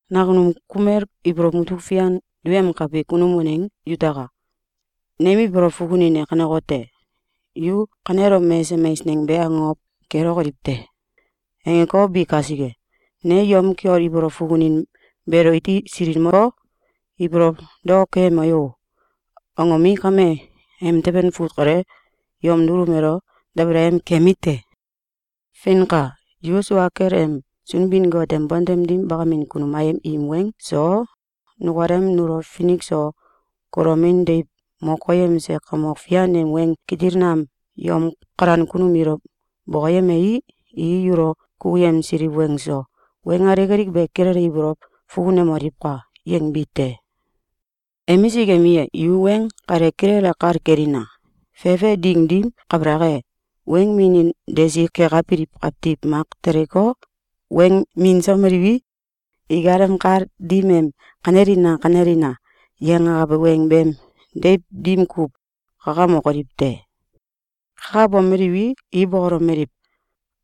Nakunum kumel ibolow mutuk fian duyemkabi kunum waneng yutaka! Nem ibolow fukunin e kanekote: “‘Yu kanelom mesesem eieneng be akokow kelokoliw te!’, angeko, bi kasike, ne yom kiol ibolow fukunin beelo iti silikmoko, ibolow daok keyemo yo!”, angomi, kame emteben fut kale yom dulum elo dabalayem kemi te. Feinka! “Yu sua kel em Sunbin-Got em bontem dim bakamin kunum ayem im weng so, nukalem nulo finik so kulomin deiw mo koyemse Kamok Fian em weng kitil nam yom kalan kunum ilo bokoyemei, i yulo kukuyemsiliw weng so, weng alik alik be kilele ibolow fukunemoliwka!”, yangbi te. Emisik emi e, yu weng kale kilele kal kelina! Fefe ding dim kabalak e, weng minin desi kekabiliw kawtiw mak teleko, weng minsomeliwi, ikalem kal dim em “Kanelina! Kanelina!”, yangakabe weng beem deiw dim kuw kakamokoliw te. Kakabomeliwi, i bokolomeliw: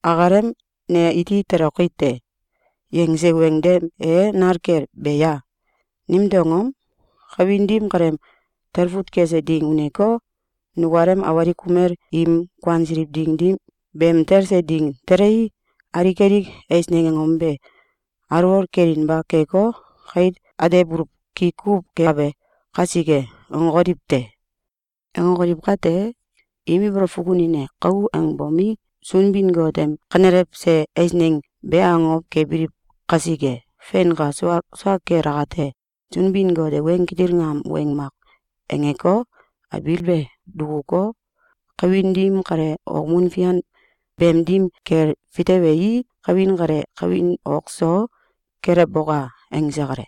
“Akalem ‘Ne iti toloki te!’, yangse weng dem e nal kel be a? Nimtew angom? Kawin dim kaleem talfut kese ding uneko, nukalem awalik kumel im kuansiliw ding dim beem talse ding telei, alik alik eisneng angom be alwol kelinba keko, kait atebuluw ki kuw kekabe kasike.”, angokoliw te. Angokoliw kate, im ibolow fukunin e kou angebomi, Sunbin-Got em kanelewse eisneng be akokow kebiliw kasike. Feinka! Sua sua kel akate, Sunbin-Got e weng kitil nam weng mak angeko, abiil be dukuko, kawin dim kale okmun fian beem dim kel fitewei, “Kawin kale kawin ok so kelewboka!”, angse kale.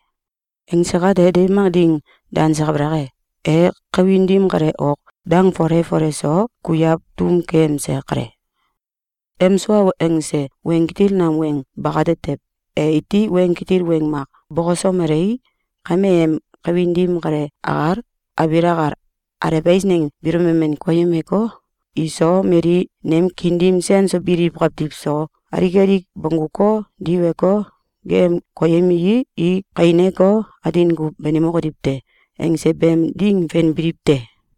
Angse kate, deiw mak ding danse kabalak e, e kawin dim kale ok dang fole fole so kuiaw tom keyemse kale. Em sua angse weng kitil nam weng bakate tew, e iti weng kitil weng mak bokosomelei, kame em kawin dim kale akal, abiil akal, alew eisneng biilo memen koyemeko, “Iso, mali nem kiin dim sen so biliw kawtiw so alik alik bongguko, diweko, geeyem koyemii, i kaineko, atin kuw banimokoliw te!”, angse beem ding fen biliw te.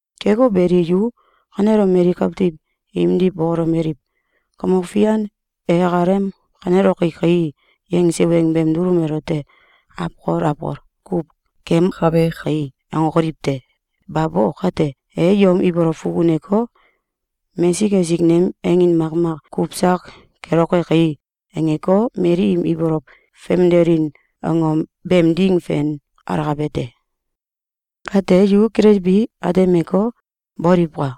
Keko beli, yu kanelom mali kawtiw imdiw bokolomeliw: “Kamok Fian e akalem ‘Kaneloki kai!’, yangse weng beem dulum elote awkol awkol kuw keemkabe kai!”, angokoliw te! Babo! Kate, e yom ibolow fukuneko, “Mesik esik nem angin makmak kuw sak keloke kai!”, angeko, mali im ibolow famdelin angom beem ding fen alakabe te. Kate yu kilelbi atemeko, boliwka!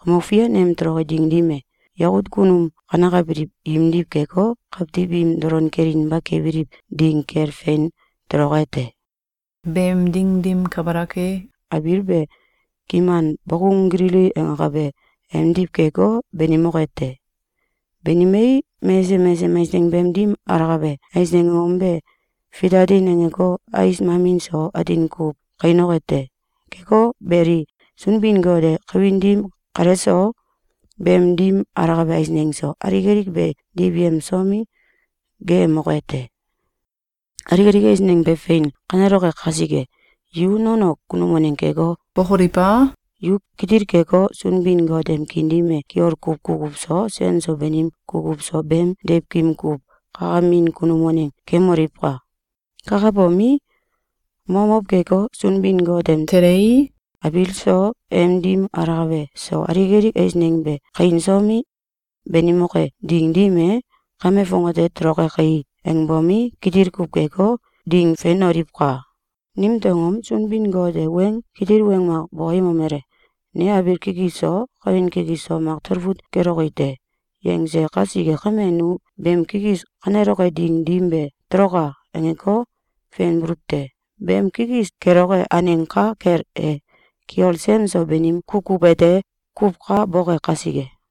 Kamok Fian em toloke ding dim e, yakut kunum kanekabiliw imdiw keko, kawtiw im dolon kelinba kebiliw ding kel fein toloke te. Beem ding dim kabalak e, abiil be kiman bokung gilili angakabe emdiw keko, banimoke te. Banimei, mesesem mesesem eisneng beem dim alakabe eisneng angom be fitatin angeko, ais mamin so atin kuw kainoke te. Keko beli, Sunbin-Got e kawin dim kale so, beem dim alakabe eisneng so, alik alik be diwyemsomi, geeyemoke te. Alik alik eisneng be fein kaneloke kasike, yu nono kunum waneng keko, bokoliw a? Yu kitil keko, Sunbin-Got em kiin dim e kiol kuw kukuw so, sen so banim kukuw so beem deiwkim kuw kakamin kunum waneng kemoliwka! Kakabomi, momow keko, “Sunbin-Got em telei, abiil so, em dim alakabe so, alik alik eisneng be kainsomi, banimoke ding dim e, kame fongate toloke kai!”, angbomi, kitil kuw keko, ding fenoliwka! Nimtew angom? Sunbin-Got e weng kitil weng mak bokoyemomele: “Ne abiil kikis so, kawin kikis so mak talfut keloki te!”, yangse kasike kame, nu beem kikis kaneloke ding dim be “Toloka!”, angeko, fenbuluw te. Beem kikis keloke aneng ka kel e, kiol sen so banim kukuw ete kuw ka boke kasike.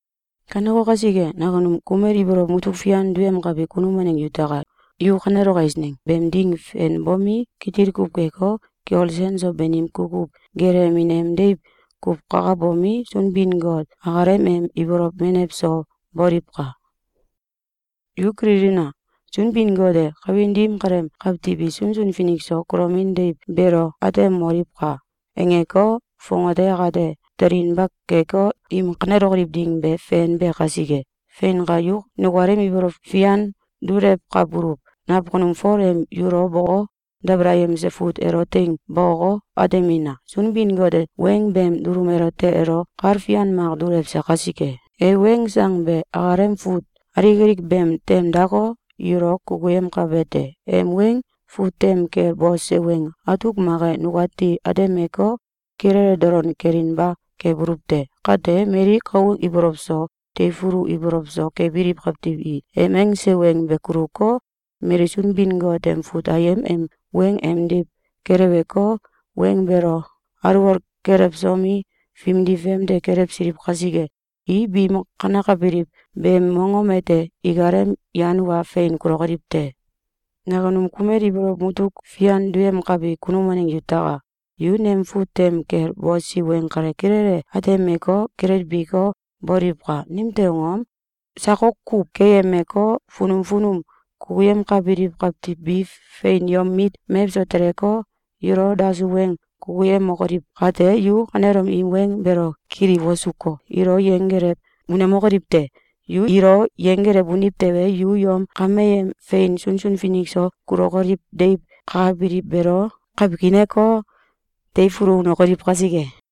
Kaneko kasike, nakunum kumel ibolow mutuk fian duyemkabi kunum waneng yutaka! Yu kaneloke eisneng beem ding fenbomi, kitil kuw keko, kiol sen so banim kukuw gelewemin em deiw kuw kakabomi, Sunbin-Got akalem em ibolow menew so boliwka! Yu kililina! Sunbin-Got e “Kawin dim kaleem kawtiw i sunsun finik so kulomin deiw beelo atemoliwka!”, angeko, fongate akate telinba keko, im kanelokoliw ding be fenbe kasike. Feinka! Yu nukalem ibolow fian dulewkabuluw nakunum Fol em yulo boko, dabalayemse fut elo teing bokoko, atemina! Sunbin-Got e weng beem dulum elote elo kal fian mak dulewse kasike, e weng sang be akalem fut alik alik beem tem dako, yulo kukuyemkabe te. Em weng fut tem kel bose weng atuk mak e nukati atemeko, kilele dolon kelinba kebuluw te. Kate, mali kou ibolow so teifulu ibolow so kebiliw kawtiw i em angse weng be kuluko, mali Sunbin-Got em fut ayem em weng emdiw keleweko, weng beelo alwol kelewsomi, fimdi famde kelewsiliw kasike, i biim kanekabiliw beem mongom ete ikalem yan wa fein kulokoliw te. Nakunum kumel ibolow mutuk fian duyemkabi kunum waneng yutaka! Yu nem fut tem kel bosi weng kale kilele atemeko, kilelbiko, boliwka! Nimtew angom? Sakok kuw keyemeko, funum funum kukuyemkabiliw kawtiw bi fein yom mit mewso teleko, yulo dasuw weng kukuyemokoliw kate, yu kanelom im weng beelo kili wosuko, ilo yenggelew unemokoliw te! Yu ilo yenggelew uniw tewe, yu yom kameem fein sunsun finik so kulokoliw deiw kakabiliw beelo kawkaineko, teifulu unokoliw kasike.